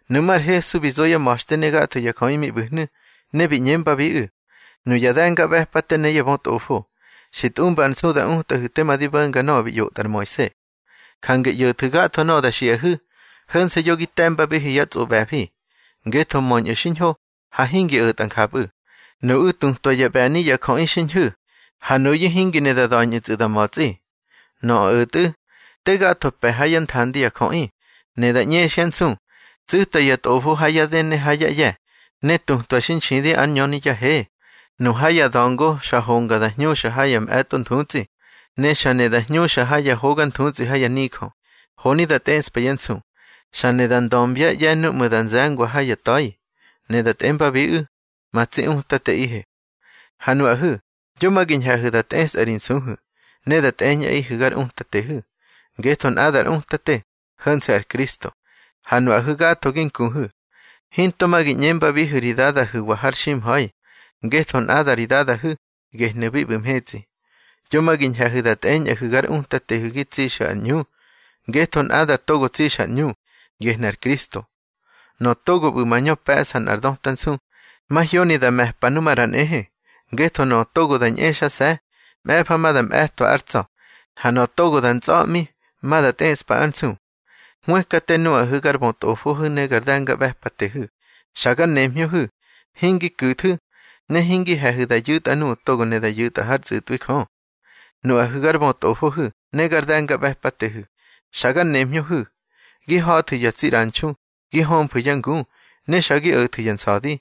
Nuꞌmú̱ ar Hesu bi zo yá ma̱xte ne gatho ya jöꞌi mi ꞌbu̱hnu̱, ne bi ꞌñembabiꞌu̱: —Nuya de̱ngaꞌbe̱pate ne ya bötꞌofo, xi tꞌumba ar nsu da utꞌahu̱ tema di bo̱nga nöꞌö bi ꞌyotꞌa ar Moise. Jange ꞌyo̱thu̱ gatho nöꞌö da xiꞌahu̱. Ho̱nse̱ yo gi te̱mbabihu̱ yá tsꞌoꞌbe̱fi, ngetho möñꞌu̱ xiñho, ha hingi o̱tꞌa njapꞌu̱. Nuꞌu̱ tutwa ya ꞌbe̱ni ya jöꞌi xi ñhu̱, ha nuyu̱ hingi ne da da̱ñꞌu̱tsꞌu̱ da ma̱tsꞌi. Nöꞌö o̱tꞌu̱, te gatho pe̱ ha yá nthandi ya jöꞌi, ne da ꞌñexyá nsu. Tsu̱ta ya tꞌofo ha yá dë ne ha yá ꞌye̱, ne tutwa xi nxidi ár ñöni yá he. Nu ha ya da̱ngo xa honga da hñuxa ha ya mꞌe̱tꞌo nthutsꞌi, ne xa ne da hñuxa ha ya hoga nthutsꞌi ha ya nijö, honi da tꞌeꞌspa yá nsu. Xa ne da ndömbyá ꞌye̱ núꞌmu̱ da nze̱ngwa ha ya ta̱i, ne da tꞌembabiꞌu̱: Ma tsi utateꞌihe. Ha nuꞌahu̱, yo ma gi ñhe̱hu̱ da tꞌesꞌahu̱ ri nsuhu̱, ne da tꞌeñꞌaꞌihu̱ gar utatehu̱. Ngetho nꞌadar Utate, ho̱nse̱ ar Kristo, ha nuꞌahu̱ gatho gi nkuhu̱. Hinto ma gi ꞌñembabihu̱ ri dadahu̱wa har ximha̱i, ngetho nꞌada ri Dadahu̱, gehnu̱ bi ꞌbu̱ mhetsꞌi. Yo ma gi ñhe̱hu̱ da tꞌeñꞌahu̱ gar utatehu̱ gi tsixu̱ ar ꞌñu, ngetho nꞌada togo tsixa ar ꞌñu, gehnu̱ ar Kristo. Nöꞌö togo ꞌbu̱ mañö pe̱ꞌsa nꞌar döta nsu, mahyoni da me̱pa nu maꞌra nꞌehe. Ngetho nöꞌö togo da ñꞌexase̱, mꞌe̱fa ma da mꞌe̱twa ár tsa̱, ha nöꞌö togo da ntsꞌa̱ꞌmi, ma da tꞌeꞌspa ár nsu. Hwëkate nuꞌahu̱ gar bötꞌofohu̱ ne gar de̱ngaꞌbe̱patehu̱, xa gar nemhñöhu̱. Hingi ku̱thu̱, ne hingi he̱hu̱ da yu̱tꞌa nuꞌu̱ togo ne da yu̱tꞌa hár tsꞌu̱tꞌwi Jö. Nuꞌahu̱ gar bötꞌofohu̱ ne gar de̱ngaꞌbe̱patehu̱, xa gar nemhñöhu̱. Gi ha̱thu̱ ya tsi ꞌranxu, gi hömfu̱ yá ngu, ne xa gi o̱thu̱ ya nsa̱di,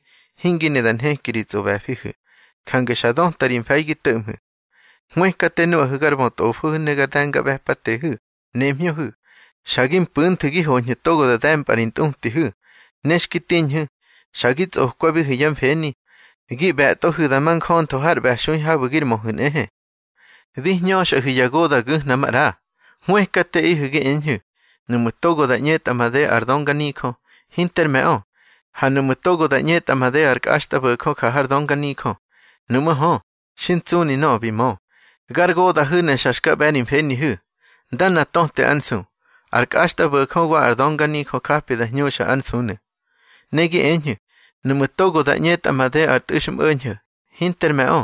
hingi ne da nheki ri tsꞌoꞌbe̱fihu̱. Jange xa döta ri mfe̱i gi to̱ꞌmhu̱. Hwëkate nuꞌahu̱ gar bötꞌofo ne gar de̱ngaꞌbe̱patehu̱, nemhñöhu̱. Xa gi mpu̱nthu̱ gi hoñhu̱ togo da de̱mpꞌa ri ntꞌutihu̱. Ne xki tiñhu̱, xa gi tsꞌokwabihu̱ yá mfeni, gi ꞌbe̱tꞌohu̱ da ma njöntho har ꞌbe̱xui habu̱ gir möhu̱ nꞌehe. Di hñöxꞌahu̱ ya goda̱ gu̱hna maꞌra. Hwëkateꞌihu̱ gi eñhu̱, nuꞌmu̱ togo da ꞌñetꞌa made ar dönganijö, hinter me̱ꞌö. Ha nuꞌmu̱ togo da ꞌñetꞌa made ar kꞌaxtꞌabo̱jö ja har dönganijö, nuꞌmú̱ hö, xi ntsꞌuni nöꞌö bi mö. Gar goda̱hu̱ ne xa xka ꞌbe̱ ri mfenihu̱. Ndana töte ár nsu, ar kꞌaxtꞌabo̱jö wa ar dönganijö japi da hñuxa ár nsunu̱. Ne gi eñhu̱, nuꞌmu̱ togo da ꞌñetꞌa made ar tꞌu̱xmꞌo̱ñho̱, hinter me̱ꞌö.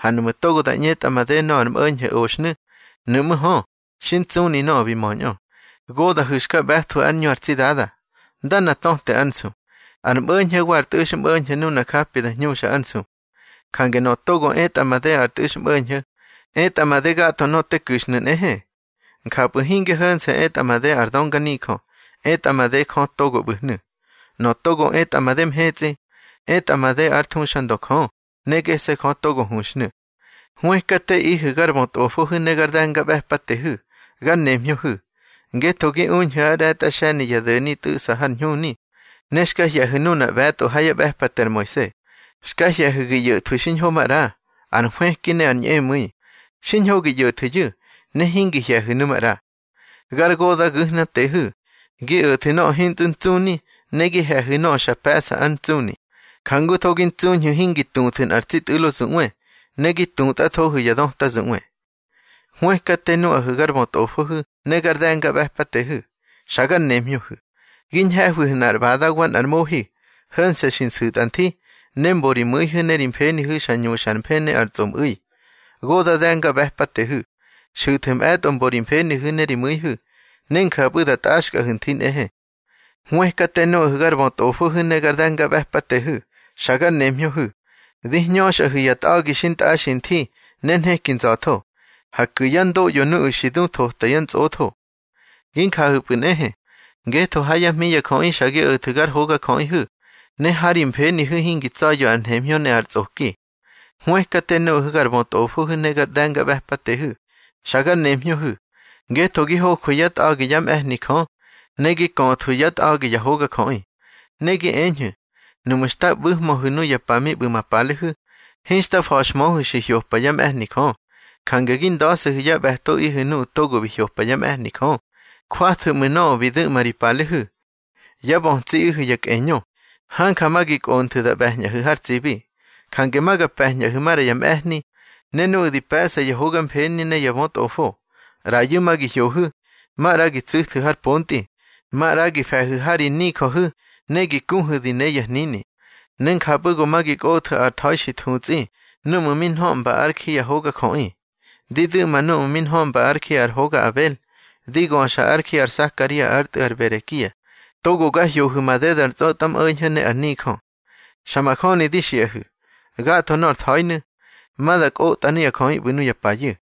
Ha nuꞌmu̱ togo da ꞌñetꞌa made nöꞌö ar mꞌo̱ñho̱ oxhnu̱, nuꞌmú̱ hö, xi ntsꞌuni nöꞌö bi möñꞌö. Goda̱hu̱ xka ꞌbe̱thwu̱ ár ꞌñu ar tsi Dada. Ndana töte ár nsu, ar mꞌo̱ñho̱ wa ar tꞌu̱xmꞌo̱ñho̱ nuna japi da hñuxa ár nsu. Jange nöꞌö togo etꞌa made ar tꞌu̱xmꞌo̱ñho̱, etꞌa made gatho nöꞌö te ku̱xhnu̱ nꞌehe. Njapꞌu̱ hinge ho̱nse̱ etꞌa made ar dönganijö, etꞌa made Jö togo ꞌbu̱hnu̱. Nöꞌö togo etꞌa made mhetsꞌi, etꞌa made ár thuxandö Jö, ne gese̱ Jö togo huxhnu̱. Hwëkateꞌihu̱ gar bötꞌofohu̱ ne gar de̱ngaꞌbe̱patehu̱, gar nemhñöhu̱. Ngetho gi uñhu̱ ár ꞌre̱tꞌa xe̱ni ya do̱ni tꞌu̱ꞌsa ar ñhuni, ne xka hye̱hu̱ nuna ꞌbe̱tꞌo ha yá ꞌbe̱pate ar Moise. Xka hye̱hu̱ gi ꞌyo̱thwu̱ xiñho maꞌra, ar nhwëki ne ar ñꞌemu̱i. Xiñho gi ꞌyo̱thu̱yu̱, ne hingi hye̱hu̱ nu maꞌra. Gar goda̱ gu̱hnatehu̱. Gi o̱thu̱ nöꞌö hintsꞌu̱ ntsꞌuni, ne gi he̱hu̱ nöꞌö xa pe̱ꞌsa ár ntsꞌuni. Jangutho gi ntsuñhu̱ hingi tuthu̱ nꞌar tsi tꞌu̱lo zuꞌwe, ne gi tutꞌathohu̱ ya döta zuꞌwe. Hwëkate nuꞌahu̱ gar bötꞌofohu̱ ne gar de̱ngaꞌbe̱patehu̱, xa gar nemhñöhu̱. Gi ñhe̱hwihu̱ nꞌar ꞌbada wa nꞌar mohi, ho̱nse̱ xi nsu̱tꞌa nthi, ne mbo ri mu̱ihu̱ ne ri mfenihu̱ xa ñuxa ar mfë ne ar tsꞌomꞌu̱i. Goda̱ de̱ngaꞌbe̱patehu̱, xu̱thu̱ mꞌe̱tꞌo mbo ri mfenihu̱ ne ri mu̱ihu̱, ne njapꞌu̱ da tꞌaxkꞌahu̱ nthi nꞌehe. Hwëkate nuꞌahu̱ gar bötꞌofohu̱ ne gar de̱ngaꞌbe̱patehu̱, xa gar nemhñöhu̱. Di hñöxꞌahu̱ ya tꞌa̱gi xintꞌaxi nthi ne nheki nza̱tho, ha ku̱ yá ndoꞌyo nuꞌu̱ xi du thota yá ntsꞌotho. Gi njahu̱pꞌu̱ nꞌehe, ngetho ha yá hmi ya jöꞌi xa gi o̱thu̱ gar hogajöꞌiꞌihu̱, ne ha ri mfenihu̱ hingi tsa̱ya̱ ar nhemhñö ne ar tsꞌoki. Hwëkate nuꞌahu̱ gar bötꞌofohu̱ ne gar de̱ngaꞌbe̱patehu̱, xa gar nemhñöhu̱. Ngetho gi hojwu̱ yá tꞌa̱gi yá mꞌe̱hni Jö, ne gi köꞌthwu̱ yá tꞌa̱gi ya hogajöꞌi. Ne gi eñhu̱: Nuꞌmu̱ xta ꞌbu̱hmöhu̱ nuya pa mi ꞌbu̱ ma palehu̱, hinxta fa̱xhmöhu̱ xi hyopa yá mꞌe̱hni Jö. Jange gi nda̱se̱hu̱ yá ꞌbe̱toꞌihu̱ nuꞌu̱ togo bi hyopa yá mꞌe̱hni Jö. Jwathu̱ ꞌmu̱ nöꞌö bi du̱ꞌma ri palehu̱. Yá bötsiꞌihu̱ ya kꞌeñö. Hanja ma gi kꞌonthu̱ da ꞌbe̱ñꞌahu̱ har tsibi. Jange ma ga pe̱ñꞌahu̱ maꞌra ya mꞌe̱hni, ne nuꞌu̱ di pe̱ꞌsa yá hoga mfeni ne ya bötꞌofo. ꞌRayu̱ ma gi hyohu̱, maꞌra gi tsu̱thu̱ har pontꞌi, maꞌra gi fe̱hu̱ ha ri nijöhu̱ ne gi kuhu̱ di ne ya hnini. Ne njapꞌu̱ go ma gi kꞌothu̱ ar tha̱i xi thutsꞌi núꞌmu̱ mi nhöꞌmba ár ji ya hogajöꞌi. Di ndu̱ꞌma núꞌmu̱ mi nhöꞌmba ár ji ar hoga Abel, di göxa ár ji ar Sakaria ár tꞌu̱ ar Berekia, togo ga hyohu̱ madeda ar tsꞌötmꞌo̱ñho̱ ne ar nijö. Xa majöni di xiꞌahu̱, gatho nor tha̱inu̱, ma da kꞌotꞌa nuya jöꞌi ꞌbu̱ nuya payu̱.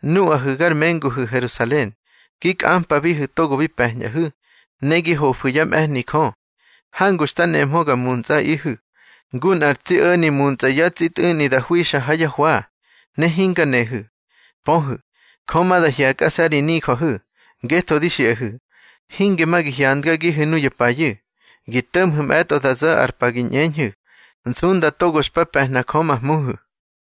Nuꞌahu̱ gar menguhu̱ Herusalen, gi kꞌampabihu̱ togo bi pe̱ñꞌahu̱, ne gi hofu̱ yá mꞌe̱hni Jö. Hangu xta nemhö nga muntsꞌaꞌihu̱, ngu nꞌar tsi o̱ni muntsꞌa yá tsi tꞌu̱ꞌni da hwixa ha yá hwa, ne hinga nehu̱. Pöhu̱, Jö ma da hye̱kꞌase̱ ri nijöhu̱. Ngetho di xiꞌahu̱, hinge ma gi hyandgagihu̱ nuya payu̱. Gi to̱ꞌmhu̱ mꞌe̱tꞌo da zo̱ ar pa gi ꞌñeñhu̱: Nsunda togo xpa pe̱hna Jö ma Hmuhu̱.